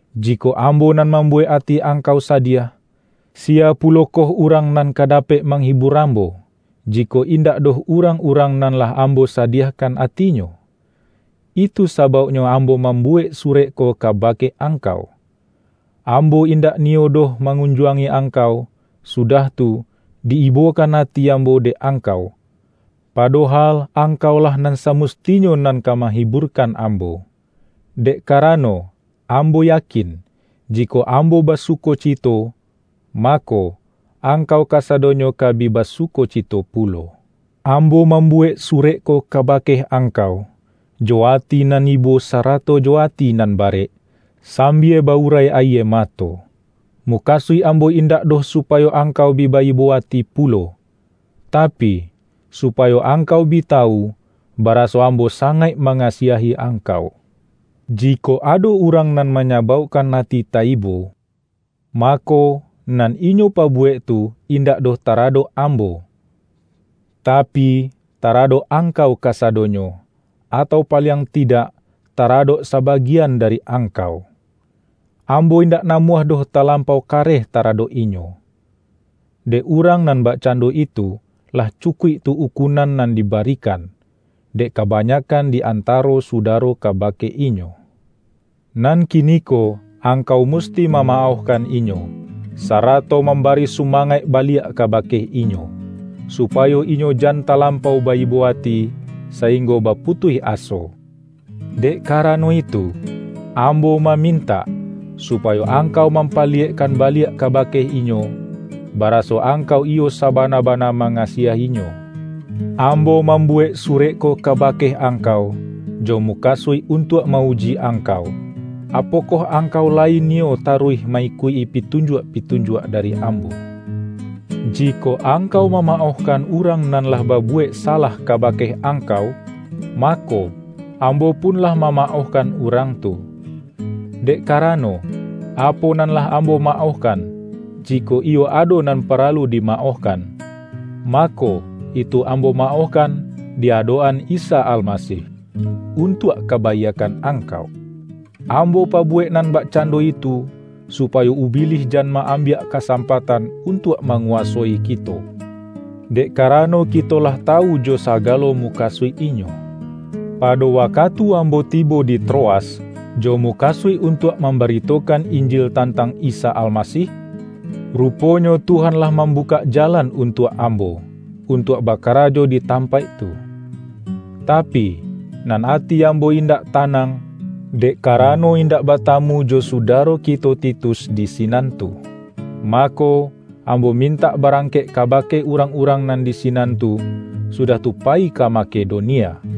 Jikok ambo nan mambuwek ati angkau sadiah, siya pulokoh urang nan ka dapek mahibur ambo, jikok in-dak doh urang-urang nan lah ambo sadiahkan atinyo? Itu sabauknyo am-bo mambuwek surek ko kabake ang-kau. Ambo indak niyo doh mangun-juangi angkau, sudah tu, di-ibokan ati ambo dek angkau, padohal angkaulah nan samustinyo nan ka mahiburkan ambo. Dek karano ambo yakin, jikok ambo basukocito, mako, angkau kasa-donyo ka bi basukocito pulo. Ambo mambuwek surek ko kabake angkau, jo ati nan ibo sarato jo ati nan barek, sambia ba-urai ayie mato. Mukasuik ambo indak doh supayo angkau bi ba-ibo ati pulo, tapi, supayo angkau bi tawu, baraso ambo sangaik manga-siahi angkau. Jikok ado urang nan manyabaukkan ati ta-ibo, mako, nan inyo pabuwek tu indak doh taradok ambo, tapi, taradok angkau kasadonyo, atau paliang tidak taradok sabagian dari angkau. Ambo indak namuah doh talampau kareh ta-radok inyo. Dek urang nan bakcando itu, lah cukuik tu ukunan nan dibari-kan, dek kabanyakkan di antaro sudaro kabake inyo. Nan kiniko angkau musti mamaohkan inyo, sarato mambari su-mangaik baliak kabake inyo, supayo inyo jan talampau ba-ibo ati, sainggo baputuih aso. Dek karano itu, ambo mamintak, supayo angkau mampali-yekkan baliak kabake inyo, baraso ang-kau iyo sabana-bana mangasiah-inyo. Ambo mambuwek surek ko kabake angkau, jo mukasuik untuak ma-uji angkau, apokoh angkau layi niyo ta-ruih ma-ikuik-i pitunjuak-pitunjuak da-ri ambo. Jikok angkau mamaohkan urang nan lah babuwek salah kabake angkau, mako, ambo pun lah mama-ohkan urang tu. Dek karano, apo nan lah ambo maohkan - jikok iyo ado nan paralu dimaohkan - mako, itu ambo maohkan di adok-an Isa Almasih, un-tuak kabaiakkan angkau. Ambo pa-buwek nan bakcando itu, supayo Ubi-lih jan ma-ambiak kasampatan untuak manguwasoi kito; dek karano kito lah tawu jo sagalo mukasuik inyo. Pado wakatu ambo tibo di Troas, jo mukasuik untuak mambaritokan In-jil tantang Isa Almasih, ruponyo Tuhan lah mambukak jalan untuak ambo, un-tuak bakarajo di tampaik tu. Tapi, nan ati ambo indak tanang, dek karano indak batamu jo sudaro kito Titus di sinan tu. Mako, ambo mintak barang-kek kabake urang-urang nan di sinan tu, sudah tu payi ka Makedonia.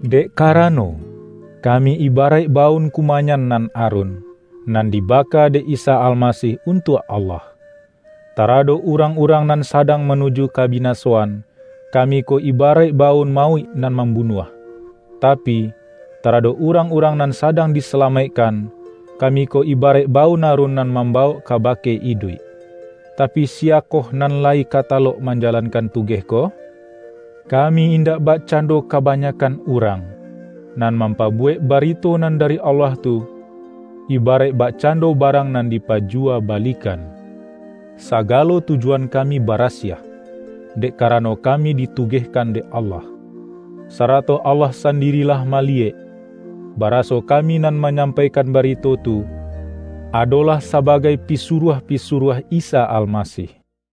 Dek karano, kami ibaraik baun kumayan nan arun, nan dibaka dek Isa Almasih untuak Allah. Taradok urang-urang nan sadang manuju ka-binasoan, kami ko ibaraik baun ma-uik nan mambunuah; tapi, taradok urang-urang nan sadang disalamaik-kan, kami ko ibaraik baun arun nan mambawok kabake iduik. Tapi, siya-koh nan layi ka talok manjalankan tu-geh ko? Kami indak bakcando ka-banyakkan urang, nan mampabuwek barito nan dari Allah tu, ibaraik bak-cando barang nan dipajuwa balikan. Sagalo tujuan kami barasiah, dek ka-rano kami ditugehkan dek Allah. Sa-rato Allah sandiri lah maliyek, bara-so kami nan manyampaikan barito tu, adolah sabagai pisuruah-pisuruah Isa Almasih.